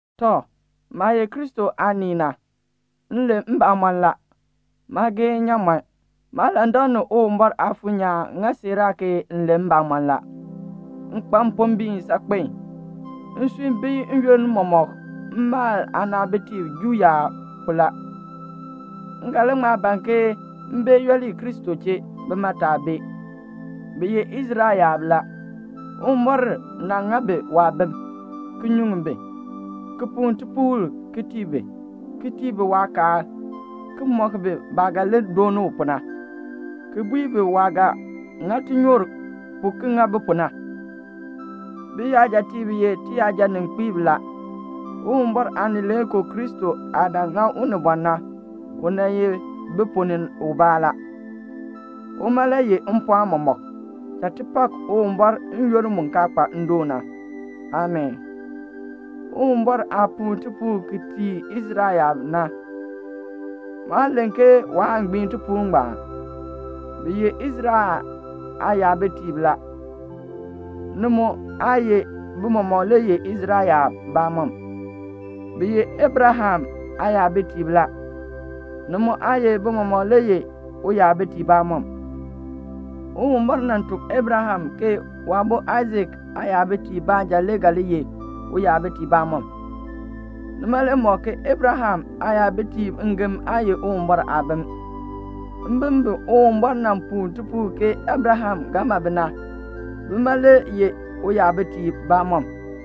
Tɔ, maah ye Kristo aanii na, m len mbamɔn la. Maa gee nnyaamɔn. Maalandak ni Uwumbɔr Aafuur nyaan ŋa siiraa ke m len mbamɔn la. M kpa mpombiin saakpen. Nsui bii n-yoonn mɔmɔk mmaal aanaabitiib Juu yaab pu la. M ga li ŋma ban ke m bee yooli Kristo chee, bima taa bee. Bi ye Israel yaab la. Uwumbɔr nan ŋa bi waabim, ki nyuŋ bi, ki puu tipuul ki tii bi, ki tii bi waakaal, ki mɔk bi baah ga li dooni u pu na, ki bui bi waah ga ŋa tinyoor pu ki ŋa bi pu na. Biyajatiib ye tiyajaninkpiib la. Uwumbɔr Aanileekoo Kristo aah nan ŋa unibɔn na, u nan ye bi ponn ni ubaa la. Uma le yeh mpɔɔn mɔmɔk. Cha ti pak Uwumbɔr n-yoonn mu kaa kpa ndoon na. Amii. Uwumbɔr aah puu tipuul ti ki tii Israel yaab na, maa len ke waa gbiin tipuul ngbaan. Bi ye Israel aayabitiib la. Ni mu aa ye bi mɔmɔk le ye Israel yaab bamɔm. Bi ye Abraham aayabitiib la. Ni mu aa ye bi mɔmɔk le ye uyabitiib bamɔm. Uwumbɔr nan tuk Abraham ke waabo Aisak aayabitiib baanja le ga li ye uyabitiib bamɔm. Nima le ŋmɔk ke Abraham aayabitiib ngem aa ye Uwumbɔr aabim. Mbim bi Uwumbɔr nan puu tipuul ke Abraham ga ma bi na, bima le ye uyabitiib bamɔm.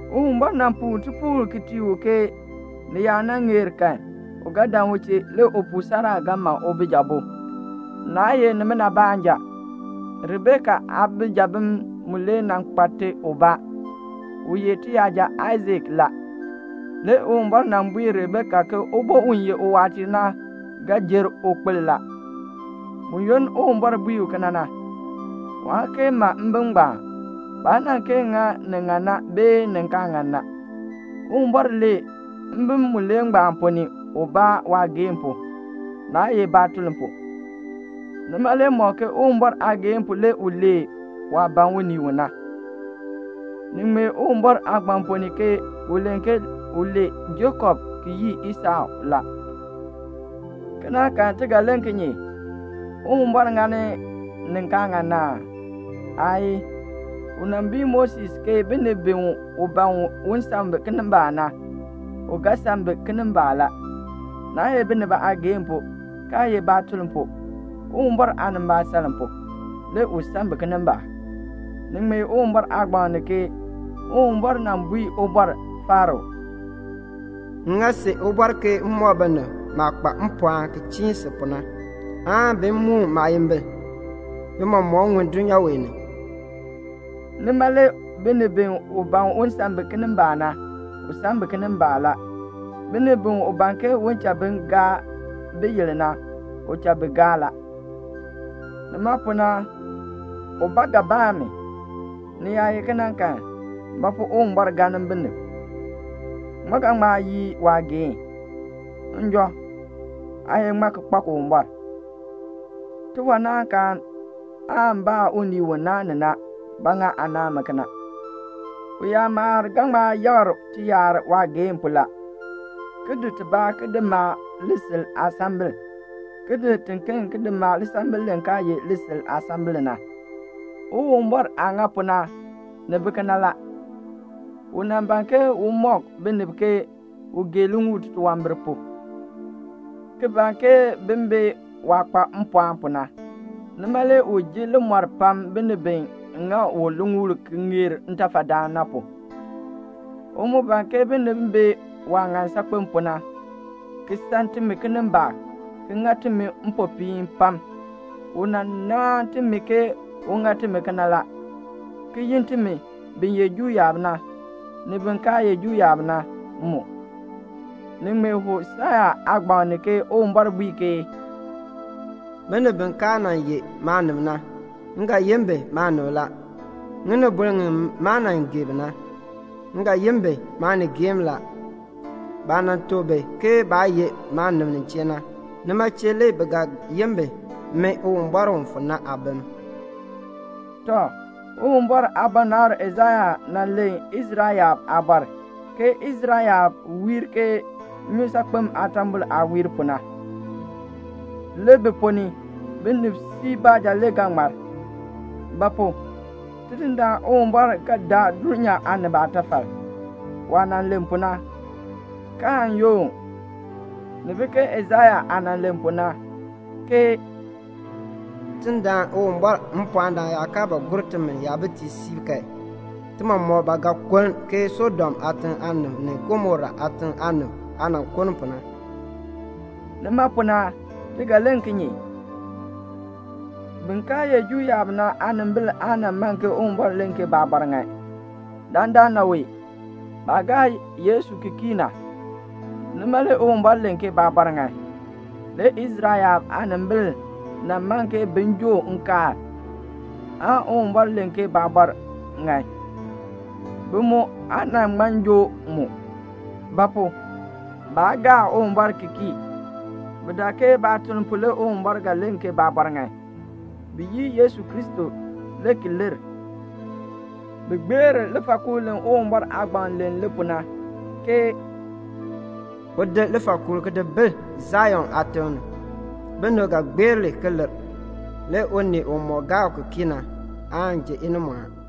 Uwumbɔr nan puu tipuul ki tii u ke ni yaa nan ŋeer kan u ga dan u chee, le upuu Sara ga ma ubijabo. Naa ye nimina baanja. Rebeka aabijabim mulee nan kpa te ubaa, u ye tiyaja Aisak la. Le Uwumbɔr nan bui Rebeka ke ubo u ye uwaatiir na ga jer ukpil la. Buyoonn Uwumbɔr bui u kena na, waa kee ma mbim ngbaan. Baa nan kee ŋa ni ŋan na bee ni kaa ŋan na. Uwumbɔr lee mbim mulee ngbaan ponn ni ubaa waageehn pu, naa ye baatuln pu. Nima le mɔk ke Uwumbɔr aageehn pu le u lee waah ban unii u na. Ni ŋmee Uwumbɔr Aagbaŋ ponn ni ke u len ke u lee Jakob ki yii Esɔ la. Kena kan, ti ga len kinye? Uwumbɔr ŋa ni kaa ŋan aa? Aayii. U nan bui Moses ke binib bi u ban u san bi kinimbaak na, u ga san bi kinimbaak la. Naa ye binib aageehn pu, kaa ye baatuln pu; Uwumbɔr aanimbaasaln pu, le u san bi kinimbaak. Ni ŋmee Uwumbɔr Aagbaŋ ni ke Uwumbɔr nan bui Ubɔr Faro, "M ŋa si ubɔr ke m mɔk binib maah kpa mpɔɔn ki chiin si pu na, aan bi moon maayimbil, bi mɔmɔk ŋun dulnyaa wee ni." Nima le binib bi u ban u san bi kinimbaak na, u san bi kinimbaak la. Binib bi u ban ke u cha bi gaa biyil na, u cha bi gaa la. Nima pu na ubaa ga baa mi, "Ni yaa ye kena kan, ba pu Uwumbɔr galn binib? Ŋmaa ga ŋma yii waageehn?" Njɔ, aa ye ŋmaa ki kpak Uwumbɔr? Tiwanaankaan aan baa unii u naan ni na, "Ba ŋa aa naan mi kena?" Uyakmakr ga ŋma yakr tiyakr waageehn pu la, ki di tibaa ti maa lisil aasambil, ki di tiken ki maa lisambil li kaa ye lisil aasambil na. Uwumbɔr aah ŋa pu na, ni bi kena la. U nan ban ke un mɔk binib ke u gee liŋuul titunwambir pu, ki ban ke bin bee waah kpa mpɔɔn pu na. Nima le u ji limɔr pam binib bi ŋa u liŋuul ki ŋeer ntafadaan na pu. U mu ban ke binib bee waah ŋan saakpen pu na, ki san timi kinimbaak, ki ŋa timi mpopiin pam. U nan naan timi ke u ŋa timi kena la, ki yin timi, bin ye Juu yaab, ni bin kaa ye Juu yaab na mu. Ni ŋmee Hosea aagbaŋ ni ke Uwumbɔr bui ke "Binib bi kaa nan ye maanib na, m ga yin bi maanib la. Ŋinibol ŋi maa nan gee bi na, m ga yin bi maanigeem la. Baah nan tuk bi ke baa ye maanib nin chee na, nima chee le bi ga yin bi Min Uwumbɔr u fu na aabim." Tɔ, Uwumbɔr aabɔnabr Aisaya nan len Israel yaab aabɔr, ke Israel yaab wiir ke nnyusaakpem aatambol aah wiir pu na, le bi ponn ni, binib siib baanja ga ŋmar; ba pu? Tidindaan Uwumbɔr ga daa dulnyaa aanib aatafal, waah nan len pu na, kaan yoon. Ni bi ke Aisaya aah nan len pu na, ke "Tidindaan Uwumbɔr mpɔɔndaan yaa kaa ba gur timi yabitiib siib kan, ti mɔmɔk ba ga kuln ke Sodom aatiŋ aanib ni Gomora aatiŋ aanib aah nan kuln pu na." Nima pu na ti ga len kinye? Bin kaa ye Juu yaab na aanimbil aa nan man ke Uwumbɔr len ke baabɔr ŋan. Dandana wee, baah gaa Yesu ki kii na, nima le Uwumbɔr len ke baabɔr ŋan. Le Israel yaab aanimbil nan man ke bin joo nkaal, aan Uwumbɔr len ke baabɔr ŋan. Bi mu aa nan ŋma joo mu; ba pu? baa gaa Uwumbɔr ki kii. Bi dak ke baatuln pu le Uwumbɔr ga len ke baabɔr ŋan. Bi yii Yesu Kristo le ki lir; bi gbeer lifaakuul li Uwumbɔr aagbaŋ len li pu na, ke "U di lifaakuul ki di bil Sion aatiŋ ni. Binib ga gbeer li ki lir. Le unii umɔk gaa u ki kii na aan ji inimɔɔn."